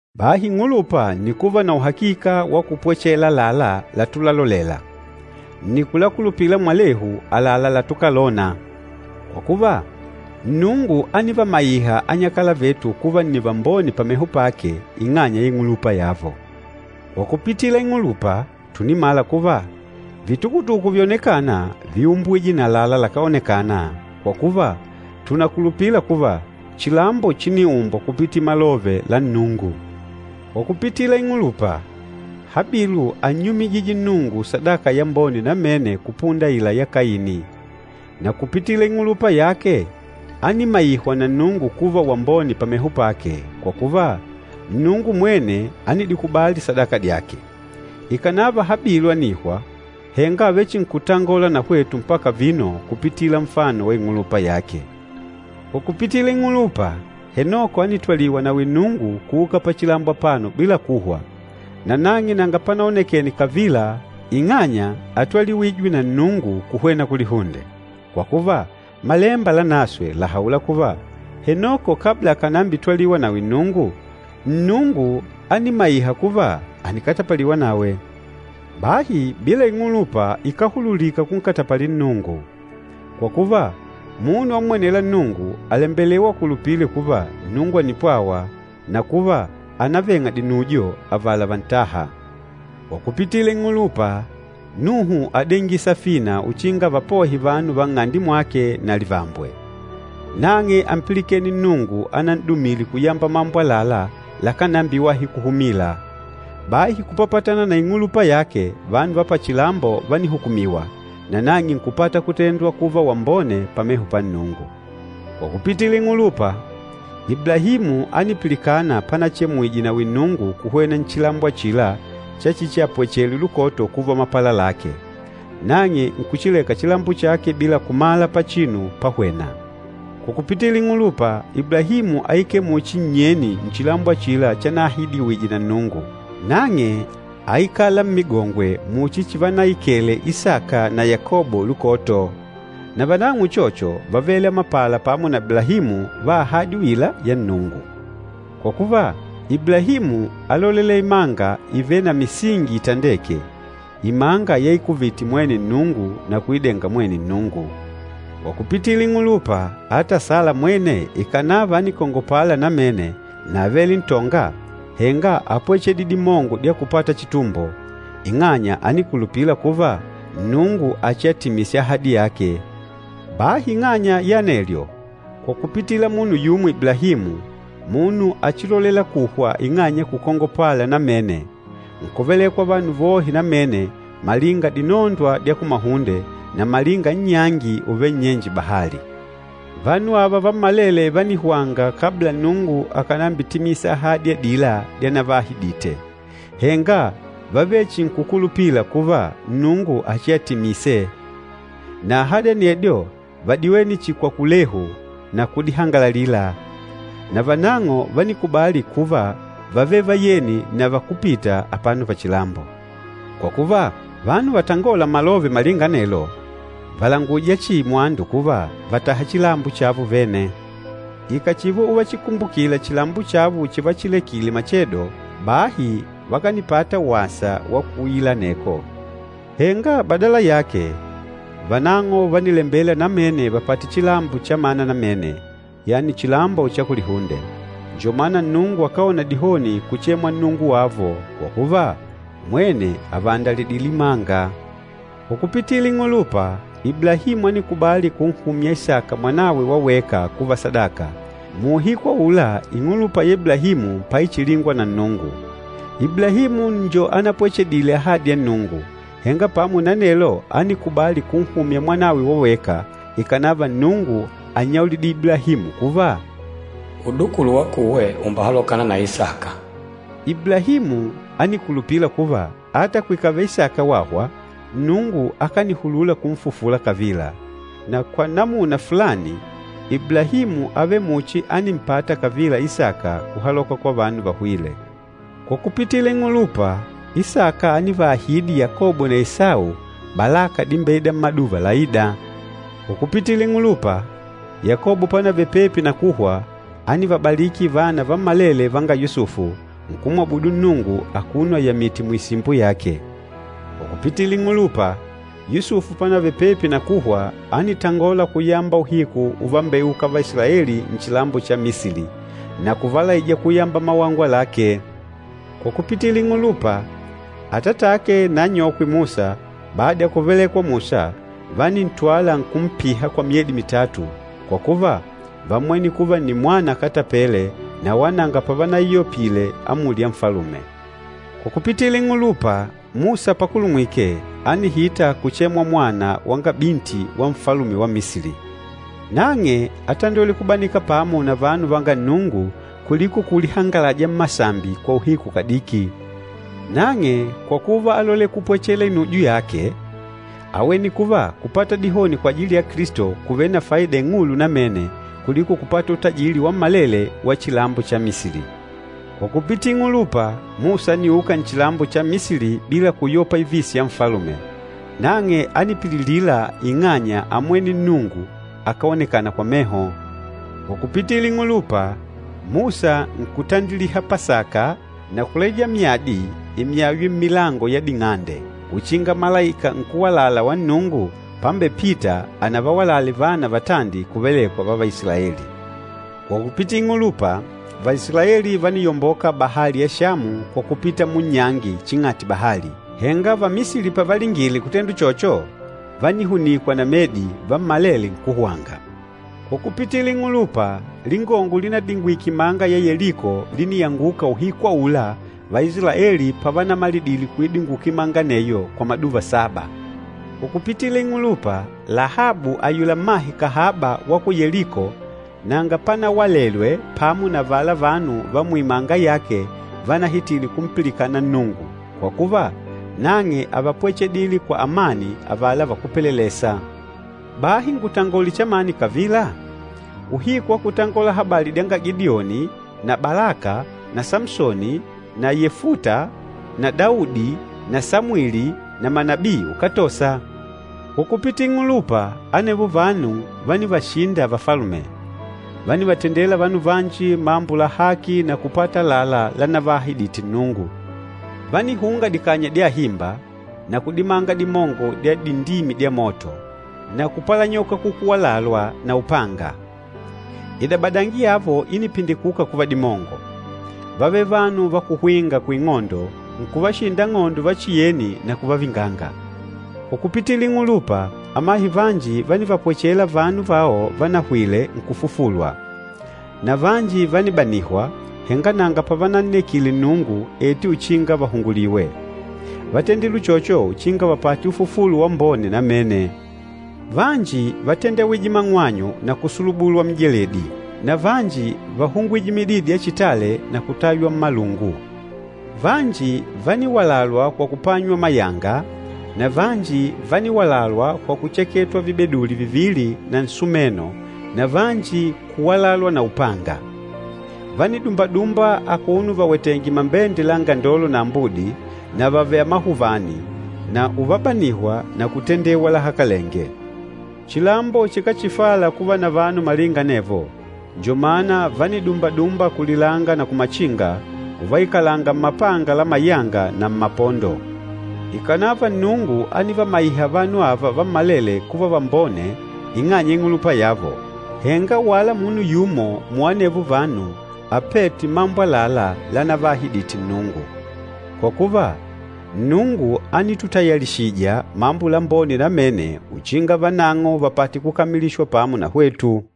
Bahi ing'ulupa nni kuva na uhakika wa kupwechela àlalá latulalolela, nni kulakulupila mwalehu àlalá latukalona. Kwa kuva, Nnungu ánivamaiha anyakala vetu kuva nni vambone pameho pake, ing'anya ya ing'ulupa yavo. Kwa kupitila ing'ulupa, tùnimala kuva, vitukutuku vyonekâna víumbwije na àlalá lakáonekana, kwa kuva, tùnakulupila kuva chilambo chíniumbwa kupitila malove la Nnungu. Kwa kupitila ing'ulupa, Habilu ánnyumijije Nnungu sadaka yambone namene kupunda aila ya Kaini. Na kupitila ing'ulupa yake ánimaihwa na Nnungu kuva wambone pameho pake, kwa kuva, Nnungu mwene ánidikubali sadaka dyake. Ikànava Habilu ànihwa, henga àvechinkutangola na hwetu mpaka vino kupitila nfano wa ing'ulupa yake. Kwa kupitila ing'ulupa, Henoko ánitwaliwa nawi Nnungu, kuuka pachilambo apano bila kuhwa. Na nang'e nanga panaonekene kavila ing'anya átwaliwijwe na Nnungu kuhwena kulihunde. Kwa kuva, Malemba Lanaswe làhaula kuva, Henoko kabla akànambitwaliwa nawi Nnungu, Nnungu ánimaiha kuva ànikatapaliwa nawe. Bahi bila ing'ulupa, ikáhululika kunkatapalila Nnungu. Kwa kuva, munu ammwenêla Nnungu àlembelewa akulupile kuva Nnungu ànipwawa, na kuva ànaveng'a dinujo avala vantâha. Kwa kupitila ing'ulupa, Nuhu ádengile safina uchinga avapohe vanu va nng'ande mwake na livambwe. Nang'e ámpilikene Nnungu anan'dumile kuyamba mambo àlalá lakánambiwahi kuhumila. Bahi kupapatana na ing'ulupa yake, vanu va pachilambo vánihukumiwa, nanang'e nkupata kutendwa kuva wambone pameho pa Nnungu. Kwa kupitila ing'ulupa, Iblahimu ánipilikana panachemwije nawi Nnungu kuhwena nchilambo achila chachichiapwechele lukoto kuva mapala lake. Nang'e nkuchileka chilambo chake bila kumala pachinu páhwènà. Kwa kupitila ing'ulupa, Iblahimu áikele muchi nnyeni nchilambo achila chanaahidiwije na Nnungu. Nang'e áikala mmigongwe muchi chivanaikele Isaka na Yakobo lukoto. Na vanang'o uchocho vávele amapala pamo na Iblahimu va ahadi uila ya Nnungu. Kwa kuva, Iblahimu álolela imanga ivêle na misingi ítandèkè, imanga yaikuvite mwene Nnungu na kuidenga mwene Nnungu. Kwa kupitila ing'ulupa, ata Sala mwene ikànava ánikongopala namene na ávele ntonga, henga ápwechedile dimongo dya kupata chitumbo, ing'anya ánikulupila kuva Nnungu achiatimise ahadi yake. Bahi ing'anya ya anelyo, kwa kupitila munu yumo Iblahimu, munu achilolela kuhwa ing'anya ya kukongopala namene, nkuvelekwa vanu vohe namene malinga dinondwa dya kumahunde, na malinga nnyangi uvêle nnyenje bahali. Vanu ava vammalele vánihwanga kabla Nnungu akànambitimisa ahadi adila dyanavaahidite, henga vávechinkukulupila kuva Nnungu achiaditimise. Na ahadi anedyo vádiwene chihi kwa kulehu na kudihangalalila. Na vanang'o vánikubali kuva vávele vayeni na vakúpita apano pachilambo. Kwa kuva, vanu vatangôla malove malinga anelo, vàlanguja chihi mwandu kuva vàtaha chilambo chavo vene. Ikàchiva uvachikumbukila chilambo chavo chivachilekile machedo, bahi vakanipata wasa wa kuuila aneko. Henga badala yake, vanang'o vánilembela namene vapate chilambo chamana namene, yani chilambo cha kulihunde. Njo mana Nnungu akáona dihoni kuchemwa Nnungu wavo, kwa kuva, mwene àvaandalidile imanga. Kwa kupitila ing'ulupa, Iblahimu ánikubali kunhumya Isaka mwanawe wa weka kuva sadaka, muuhiku aula ing'ulupa ya Iblahimu paichilingwa na Nnungu. Iblahimu njo anapwechedile ahadi ya Nnungu, henga pamo na anelo ánikubali kunhumya mwanawe wa weka, ikànava Nnungu ánnyaulidile Iblahimu kuva, “Udukulu wakuwe ùmbehalokana na Isaka.” Iblahimu ánikulupila kuva ata kwikavele Isaka wahwa, Nnungu akanihulula kunfufula kavila. Na kwa namuna fulani, Iblahimu ávele muchi ánimpata kavila Isaka kuhaloka kwa vanu vahwîle. Kwa kupitila ing'ulupa, Isaka ánivaahidi Yakobo na Esau, balaka dimbeîda mmaduva laîda. Kwa kupitila ing'ulupa, Yakobo panavele pepi na kuhwa, ánivabaliki vana vammalele vanga Yusufu, nkumwabudu Nnungu akuno ayamìtè muisimbo yake. Kwa kupitila ing'ulupa, Yusufu panavele pepi na kuhwa ánitangola kuyamba uhiku uvambeuka Vaisilaeli nchilambo cha Misili, na kuvalaija kuyamba mawangwa lake. Kwa kupitila ing'ulupa, atatake na anyokwe Musa bada ya kuvalekwa Musa, vánintwala nkumpiha kwa myedi mitatu, kwa kuva, vámmwene kuva nni mwana akatapele na wala nanga pavanaiyopile amuli ya nfalume. Kwa kupitila ing'ulupa, Musa pakulumwike, ánihita kuchemwa mwana wanga piti wa Nfalume wa Misili. Nang'e átandwele kubanika pamo na vanu vanga Nnungu kuliko kulihangalaja mmasambi kwa uhiku kadiki. Nang'e kwa kuva álolela kupwechela inujo yake, áwene kuva kupata dihoni kwajili ya Kilisto kùvele na faida ing'ulu namene kuliko kupata utajili wammalele wa chilambo cha Misili. Kwa kupitila ing'ulupa, Musa ániuka nchilambo cha Misili bila kuyopa ivisi ya nfalume, nang'e ánipililila ing'anya ámmwene Nnungu, akáonekana kwa meho. Kwa kupitila ing'ulupa, Musa nkutandiliha Pasaka na kulaija myadi imyaywe mmilango ya ding'ande uchinga Malaika Nkúwalala wa Nnungu pambepita anavawalale vana vatandi kuvelekwa va Vaisilaeli. Kwa kupitila ing'ulupa, Vaisilaeli vániyomboka bahali ya Shamu kwa kupita munnyangi ching'ati bahali. Henga Vamisili pavalingile kutenda uchocho, vánihunikwa na medi, vammalele nkuhwanga. Kwa kupitila ing'ulupa, lingongo línadingwike imanga ya Yeliko líniyanguka uhiku aula Vaisilaeli pavanamalidile kuidinguka imanga aneyo kwa maduva saba. Kwa kupitila ing'ulupa, Lahabu ayula mmahe kahaba wa ku Yeliko nanga panawalelwe pamo na avala vanu va muimanga yake vanahitîle kumpilikana Nnungu, kwa kuva, nang'e ávapwechedile kwa amani avala vakúpelelesa. Bahi ngutangole chamani kavila? Uhiku wa kutangola habali dyanga Gidioni na Balaka na Samsoni na Yefuta na Daudi na Samwili na manabii, ukátosa. Kwa kupitila ing'ulupa, anevo vanu vánivashinda vafalume. Vánivatendela vanu vanji mambo la haki na kupata àlalá lanavaahidite Nnungu. Vánihunga dikanya dya ahimba, na kudimanga dimongo dya dindimi dya moto, na kupalanyoka kukuwalalwa na upanga. Idabadangi yavo ínipindikuka kuva dimongo. Vávele vanu va kuhwinga kuing'ondo, nkuvashinda ang'ondo vachiyeni na kuvavinganga. Kwa kupitila ing'ulupa, amahe vanji vánivapwechela vanu vao vanahwile nkufufulwa. Na vanji vánibanihwa, henga nanga pavanannekile Nnungu eti uchinga vahunguliwe. Vátendile uchocho uchinga vapate ufufulo wambone namene. Vanji vátendewije mang'wanyu na kusulubulwa mijeledi, na vanji váhungwije mididi ya chitale na kutaywa mmalungu. Vanji vániwalalwa kwa kupanywa mayanga, na vanji vániwalalwa kwa kucheketanywa vibeduli vivili na nsumeno na vanji kuwalalwa na upanga. Vánidumbadumba akuno vawetèngè mambende la angandolo na ambudi, na vavèlè amahuvani, na uvabanihwa na kutendewa lahakalenge. Chilambo chikáchifala kuva na vanu malinga anevo, njo mana vánidumbadumba kulilanga na kumachinga, uvaikalanga mmapanga la mayanga na mmapondo. Ikànava Nnungu ánivamaiha vanu ava vammalele kuva vambone ing'anya ya ing'ulupa yavo, henga wala munu yumo muanevo vanu apête mambo àlalá lanavaahidite Nnungu. Kwa kuva, Nnungu ánitutayalishija mambo lambone namene uchinga vanang'o vapate kukamilishwa pamo na hwetu.